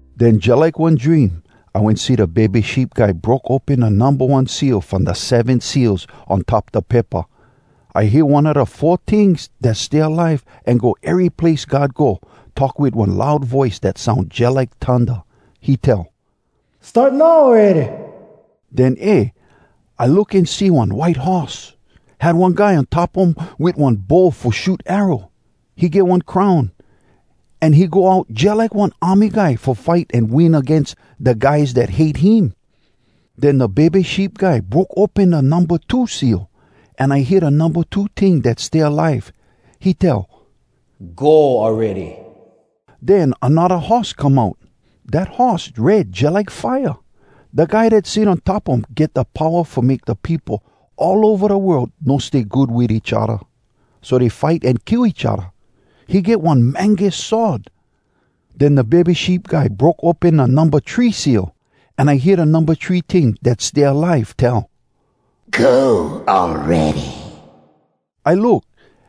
Den, jalike one dream, I wen see da Bebe Sheep Guy broke open da numba one seal from da seven seals on top da paypa. I hear one a da four tings dat stay alive an go ery place God go talk wit one loud voice dat soun jalike thunda. He tell, “Start now awready!” Den, eh! I look an see one white horse. Had one guy on top um wit one bow fo shoot arrow. He get one crown. An he go out jalike one army guy fo fight an win agains da guys dat hate him. Den da Bebe Sheep Guy broke open da numba two seal. An I hear da numba two ting dat stay alive, he tell, “Go awready!” Den anodda horse come out. Dat horse red jalike fire. Da guy dat sit on top um get da powa fo make da peopo all ova da world no stay good wit each odda, so dey fight an kill each odda. He get one mangus sword. Den da Bebe Sheep Guy broke open da numba three seal. An I hear da numba three ting dat stay alive tell, “Go awready!” I look,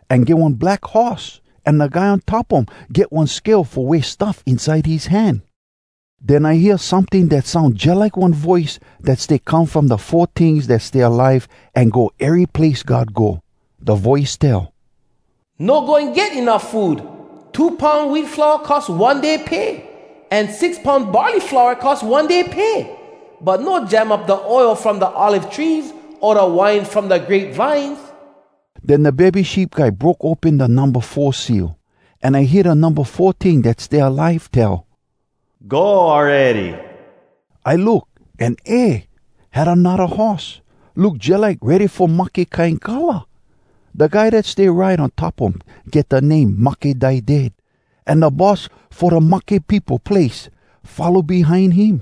an get one black horse, an da guy on top um get one scale fo weigh stuff inside his hand. Den I hear someting dat soun jalike one voice dat stay come from da four tings dat stay alive an go ery place God go. Da voice tell, “No goin get enuff food! Two poun wheat flour cost one day pay, an six poun barley flour cost one day pay. But no jam up da oil from da olive trees o da wine from da grape vines!” Den da Bebe Sheep Guy broke open da numba four seal. An I hear da numba four ting dat stay alive tell, “Go awready!” I look, an eh! Had anodda horse. Look jalike ready-fo-mahke kine color! Da guy dat stay ride on top um get da name Mahke Die Dead, an da boss fo da Mahke Peopo Place follow behind him.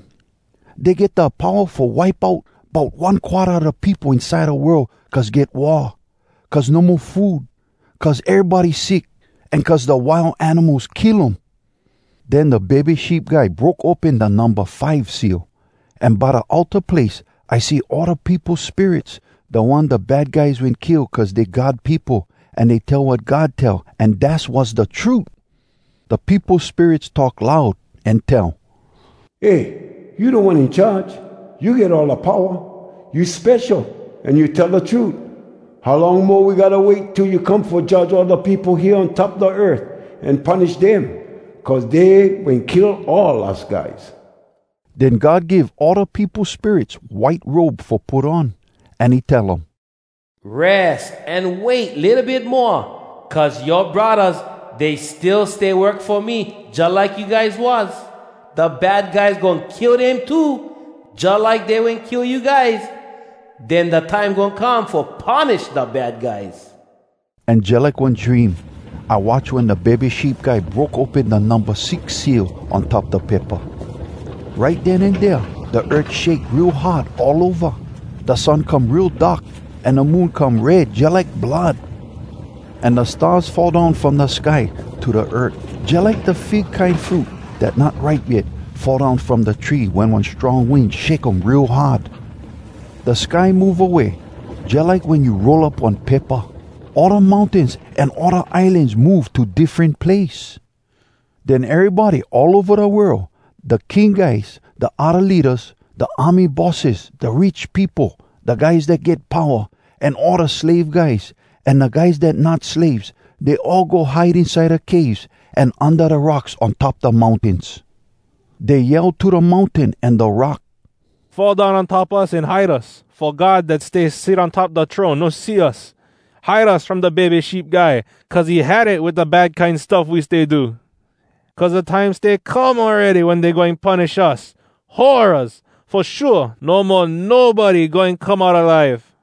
Dey get da powa fo wipe out bout one quarta a da peopo inside da world cuz get war, cuz no mo food, cuz erybody sick, an cuz da wild animals kill um. Den da Bebe Sheep Guy broke open da numba five seal. An by da altar place I see all da peopo spirits, da one da bad guys wen kill cuz dey God peopo, an dey tell wat God tell, an dass was da trut. Da peopo spirits talk loud, an tell, “Eh, you Da One In Charge! You get all da powa! You spesho, an you tell da trut! How long mo we gotta wait till you come fo judge all da peopo hea on top da earth an punish dem? Cuz dey wen kill all us guys!” Den God give all da peopo spirits white robe fo put on. An he tell um, “Res an wait litto bit moa. Cuz yoa braddahs, dey still stay work fo me jalike you guys was. Da bad guys goin kill dem too jalike dey wen kill you guys. Den da time goin come fo punish da bad guys.” An jalike one dream, I watch wen da Bebe Sheep Guy broke open da numba six seal on top da paypa. Right den an dea da earth shake real hard all ova! Da sun come real dark, an da moon come red jalike blood. An da stars fall down from da sky to da earth, jalike da fig kine fruit dat not ripe yet fall down from da tree wen one strong wind shake um real hard. Da sky move away, jalike wen you roll up one paypa! All da mountains an all da islans move to diffren place. Den erybody all ova da world, da king guys, da odda leadas, da army bosses, da rich peopo, da guys dat get powa, an all da slave guys, an da guys dat not slaves, dey all go hide inside da caves, an unda da rocks on top da mountains. Dey yell to da mountain an da rock, “Fall down on top us an hide us, fo God dat stay sit on top da throne no see us! Hide us from da Bebe Sheep Guy, cuz he had it wit da bad kine stuff we stay do! Cuz da time stay come awready wen dey goin punish us. Horraz! Fo shua, no mo nobody goin come out alive!”